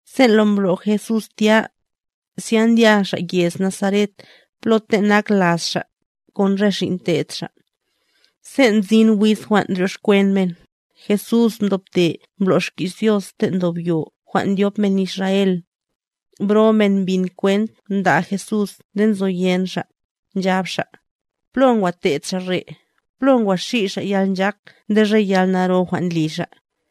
Sen' lo mbro' Jesús tya, zya ndya Xa' yez Nazaret plo ten' nak laz Xa', kon re xin' te'd Xa'. Sen' mzin wiz jwan' ndryoxkwen men, Jesús mdobte mblo' xki's Dios ten' ndob yo jwan' ndyop men Israel; bro men mbin kwent nda' Jesús nde nzoyen xa', nchab xa': —¿Plo ngwa te'd Xa' re'? ¿Plo ngwa xi' Xa' yalnchak nde re yalnaro jwan' ndli Xa'?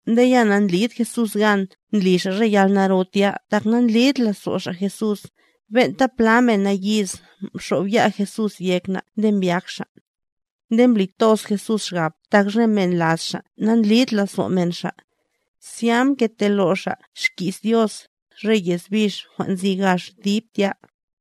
Nde ya nandlid Jesús gan ndli Xa' re yalnaro tya tak na'ndlid lazo' xa' Jesús, ben'ta plata men nayiz mxob ya' Jesús yek na' nde mbyak xa'. Nde mbli toz Jesús xgab tak re men laz Xa' nandlid lazo' men Xa'. Zya mketelo' Xa' xki's Dios, re yez bix jwan' nzi gax dib tya.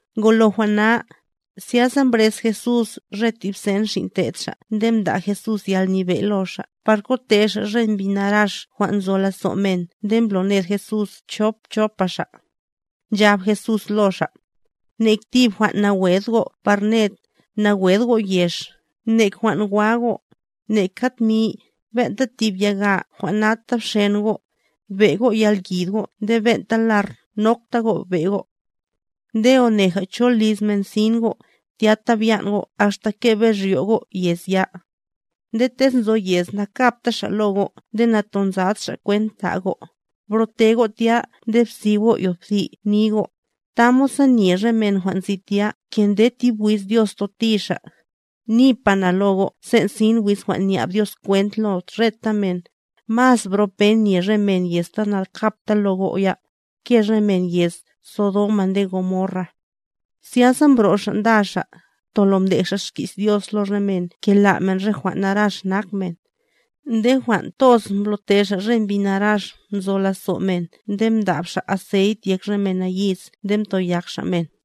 Ngolo jwan' na, zyasa mbrez Jesús re tib sen xin' te'd Xa' nde mda' Jesús yalnyebe' lo xa' par kote xa' re mbi narax jwan' nzo lazo' men nde mbloned Jesús chop chopa xa'. Nchab Jesús lo xa': —Nek tib jwan' nawed go' par ned, nawed go' yex, nek jwan' wa go', neka tmi, ben'ta tib yaga jwan' nata bxen go', be' go' yalyid go' nde ben'ta lar nokta go' we go'. Nde one cho liz men sin go', tyata byan' go' axta kebe' ryo' go' yez ya. Nde tez nzo yez nakabta xa' lo go' nde natonzad xa' kwent ta' go', bro'te go' tya nde bsib go' yothi' ni go', tamod sa nye re men jwan' nzi tya ke nde tib wiz Dios toti xa'. Nipa na lo go' sen' sin wiz jwan' nyab Dios kwent lo reta men, mas bro pen nye re men yez ta nankabta lo go' ya, ke re men yez Sodoma nde Gomorra. Zyasa mbro' xa' nda xa', tolo mdej xa' xki's Dios lo re men ke la' men re jwan' narax nak men. Nde jwan' toz mblo'te xa' re mbi narax nzo lazo' men nde mda'b xa' aceit yek re men nayiz nde mtoyak Xa' men.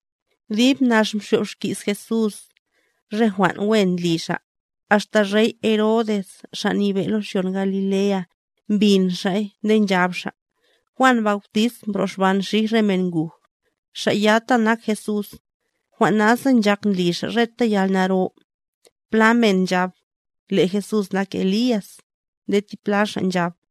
Dib nax mxyob xki's Jesús, re jwan' wen ndli Xa', axta rey Herodes xa' nyebe' lo xyon Galilea, mbin xa'y nde nchab xa': —Juan Bautist mbroxban xij re men nguj, xa' ya ta nak Jesús, jwan' nasa nchak ndli xa' reta yalnaro. Pla men nchab: —Le' Jesús nak Elías.b Nde tipla xa' nchab: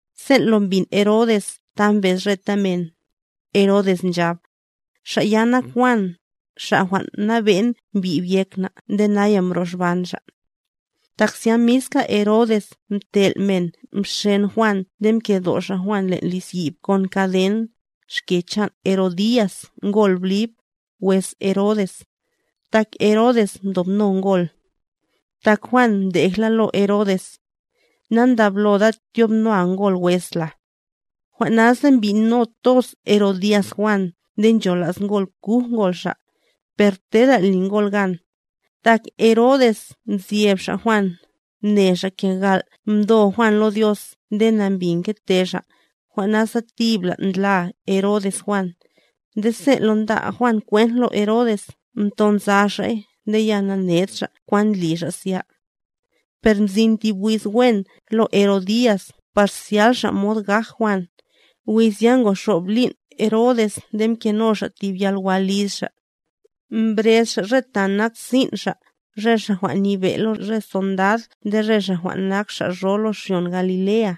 Sen' lo mbin Herodes ta mbez reta men, Herodes nchab: —Xa' ya nak Juan, xa' jwan' mnabe'n mbyib yek na' nde naya mbroxban xa'. Tak zya miska Herodes mtel' men mxen Juan nde mkedo' xa' Juan len' liz yib kon kaden, xke chan' Herodías ngol Blib, wes Herodes, tak Herodes mdobno ngol. Tak Juan mdejla lo Herodes: —Nandabloda tyob noa ngol wes la. Jwan' nasa mbyi'no toz Herodías Juan nde nchola's ngol kuj ngol xa', per tera li ngol gan, tak Herodes mzyeb xa' Juan, mne xa' ke gal' mdo Juan lo Dios nde nambi mgete xa', jwan' nasa tibla ndla Herodes Juan; nde sen' lo nda' Juan kwent lo Herodes mtonza xa'y nde ya namned xa' kwan ndli xa' zya. Per mzin tib wiz wen lo Herodías par zyal xa' mod gaj Juan, wiz ya ngoxob lin' Herodes nde mkeno xa' tib yalwa liz xa'. Mbrez xa' re ta nak sin' xa', re xa' jwan' nyebe' lo re sondad nde re xa' jwan' nak xa' ro lo xyon Galilea,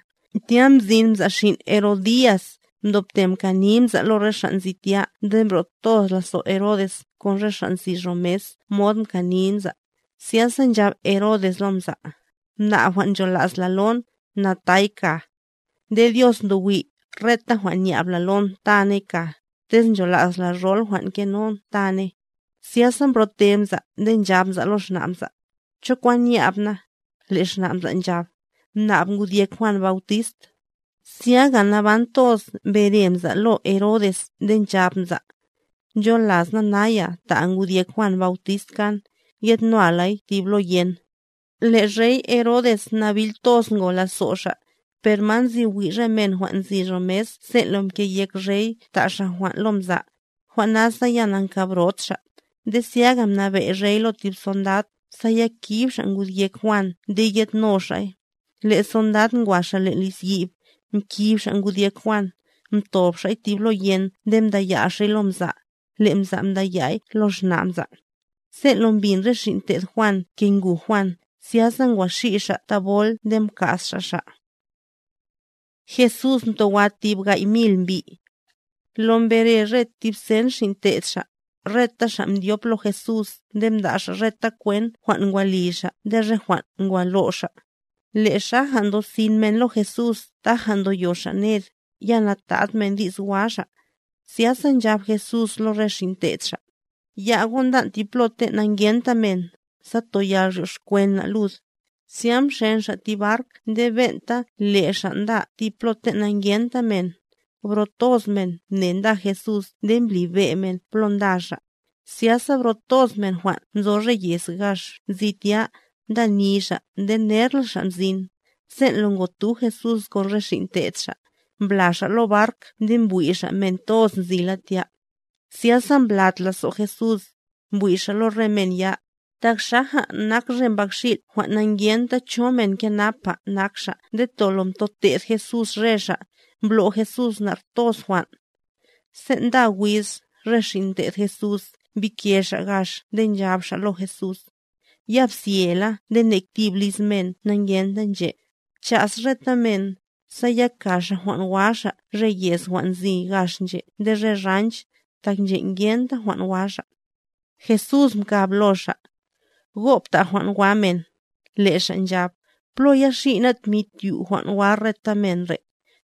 tya mzin mza' xin' Herodías, mdobte mkani mza' lo re xa' nzi tya nde mbro' toz lazo' Herodes kon re xa' nzi ro mes mod mkani mza'. Zyasa nchab Herodes lo mza': —Mnab jwan' nchola's la lon, na tay kaa. Nde Dios ndo wi', reta jwan' nyab la lon taney kaa, tez nchola's la rol jwan' ngenon taney. Zyasa mbro'te mza' nde nchab mza' lo xna' mza': —¿Cho kwan nyab na? Le' xna' mza' nchab: —Mnab ngud yek Juan Bautist. Zyaga naban toz mbere mza' lo Herodes nde nchab mza': —Ncholas na naya ta'a ngud yek Juan Bautist kan, yedno lay tib lo yen. Le' Rey Herodes nabil toz ngo lazo' xa'; per ma nzi wi' re men jwan' nzi ro mes sen' lo mke'yek rey ta' xa' jwan' lo mza', jwan' nasa ya na'nkabrot xa'. Nde zyaga mnabe' rey lo tib sondad, sa ya kib xa' ngud yek Juan nde yedno xa'y. Le' sondad ngwa xa' len' liz yib, mkib xa' ngud yek Juan, mdob xa'y tib lo yen nde mdaya' xa'y lo mza', le' mza' mda'y lo xna' mza'. Sen' lo mbin re xin' te'd Juan ke nguj Juan, zyasa ngwa xi' xa' thabol nde mka's xa' xa'. Jesús mtowa tib gay' mil mbi' Lo mbere re tib sen xin' te'd xa', reta xa' mdyop lo Jesús nde mda' xa' reta kwent jwan' ngwa li xa' nde re jwan' ngwa lo' xa'. Le' xaja ndosin men lo Jesús taja ndoyo xa' ned, ya natad men di's wa xa'. Zyasa nchab Jesús lo re xin' te'd xa': —Ya' go' ndan' tib plo ten' na'ngenta men, sa toyal ryoxkwen na' lud. Zya mxen xa' tib bark nde ben'ta le' xa' nda tib plo ten' na'ngenta men. Bro toz men mne nda Jesús nde mblibe' men plo nda xa'; zyasa bro toz men jwan' nzo re yez gax nzi tya, nda ni xa' nde nerla xa' mzin. Sen' lo ngotu Jesús kon re xin' te'd xa', mbla xa' lo bark nde mbwi' xa' men toz nzila tya. Zyasa mblat lazo' Jesús, mbwi' Xa' lo re men ya, tak xaja nak re mbakxil' jwan' na'ngenta cho men kenapa nak xa' nde tolo mdote'd Jesús re xa', mblo' Jesús nar toz jwan'. Sen' nda wiz, re xin' te'd Jesús mbike xa' gax nde nchab xa' lo Jesús: —Ya bzyela nde nek tib liz men na'ngenta nche'. Bcha's reta men, sa ya ka xa' jwan' wa xa' re yez jwan' nzi gax nche' nde re ranch, tak nche' ngenta jwan' wa xa'. Jesús mkab lo xa': —Go' bta' jwan' wa men. Le' xa' nchab: —¿Plo ya xi' ná' tmi tyu' jwan' wa reta men re'?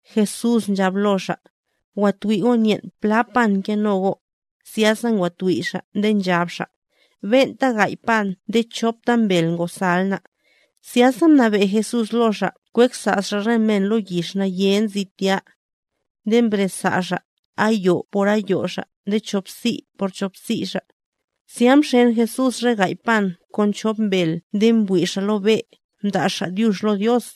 Jesús nchab lo xa': —Wa twi' go' nyen' pla pan ngeno go'. Zyasa ngwa twi' xa' nde nchab xa': —Ben'ta gay' pan nde chop mbel ngosal ná'. Zyasa mnabe' Jesús lo xa' kweksa' xa' re men lo yix naye nzi tya. Nde mbreza' xa', ayo' por ayo' xa' nde cho'psi' por cho'psi' xa'. Zya mxen Jesús re gay' pan kon rop mbel nde mbwi' Xa' lo be', mda' Xa' dyux lo Dios.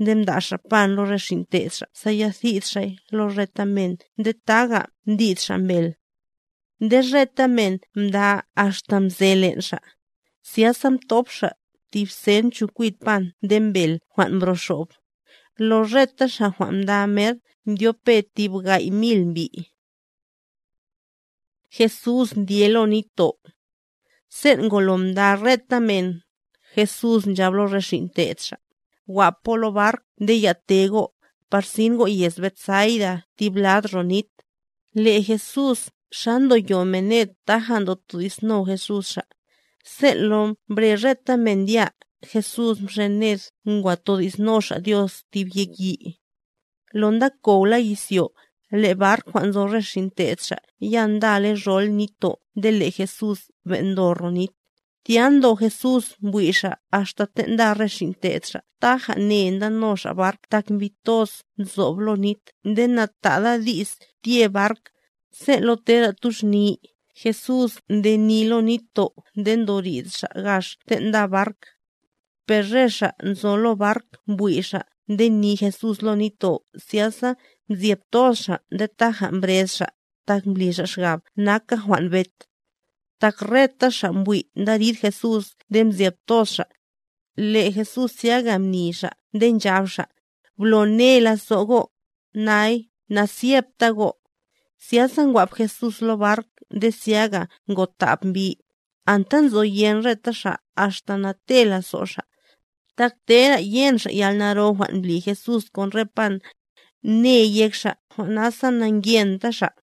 Nde mda' Xa' pan lo re xin' te'd Xa' sa ya thid xa'y lo reta men nde taga mdid Xa' mbel. Nde reta men mda axta mze len' xa'. Zyasa mthop xa' tib sen chokwid pan nde mbel jwan' mbroxob. Lo reta xa' jwan' mda mer mdyopbe tib gay' mil mbi'. Jesús ndye lo nitto' Sen' ngolo mda reta men, Jesús nchab lo re xin' te'd xa': —Wap go' lo bark nde ya'te go', par sin go' yez Betsaida tib lad ro nit. Le' Jesús, xa ndo yo men ned taja ndotodi'sno Jesús xa'. Sen' lo mbre reta men ndya, Jesús mxen ned ngwa todi'sno Xa' Dios tib yek yi'. Lo ndakowla izyo, le' bark jwan' nzo re xin' te'd Xa' ya ndale rol nitto' nde le' Jesús ben' ndo ro nit. Tya ndo Jesús mbwi' Xa' axta ten' nda re xin' te'd Xa' taja ne ndano xa' bark tak mbi toz nzob lo nit nde natade di's tye bark, sen' lo tera tuxni, Jesús nde ni lo nitto' nde ndorid Xa' gax ten' nda bark. Per re xa' nzo lo bark mbwi' xa' nde ni Jesús lo nitto' zyasa mzyeb toz xa' nde taja mbrez xa', tak mbli xa' xgab naka jwan' bet. Tak reta xa' mbwi' ndarid Jesús nde mzyeb toz xa'. Le' Jesús zyaga mni Xa' nde nchab Xa': —Blo ne lazo' go', nay, na'zyepta go'. Zyasa ngwap Jesús lo bark nde zyaga ngotab mbi, anta nzoyen reta xa' axta nate' lazo' xa'. Tak tera yen xa' yalnaro jwan' mbli Jesús kon re pan, ne yek xa' jwan' nasa na'ngyenta xa'.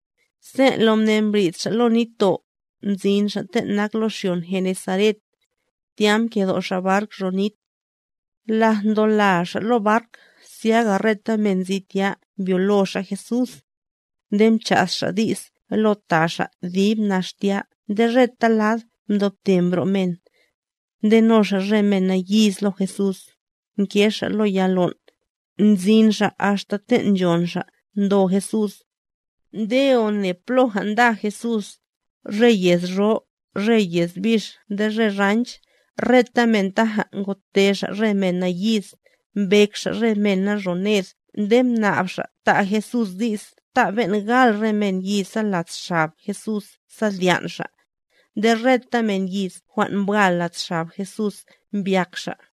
Sen' lo mne mbrid xa' lo nitto', mzin xa' ten' nak lo xyon Genesaret, tya mkedo' xa' bark ro nit. Laj ndola xa' lo bark, zyaga reta men nzi tya mbyolo xa' Jesús. Nde mcha's xa' di's lo ta xa' dib nax tya nde reta lad mdobte mbro' men, ndeno xa' re men nayiz lo Jesús, nge xa' lo ya lon', nzin xa' axta ten' nchon xa' ndo Jesús. Nde one ploja nda Jesús, re yez ro, re yez bix nde re ranch, reta men taja ngote xa' re men nayiz, mbek xa' re mena ro ned nde mnab xa' ta' Jesús di's ta'a ben' gal re men yiza lad xab Jesús sa dyan' xa'. Nde reta men yiz jwan' mbwal lad xab Jesús mbyak xa'.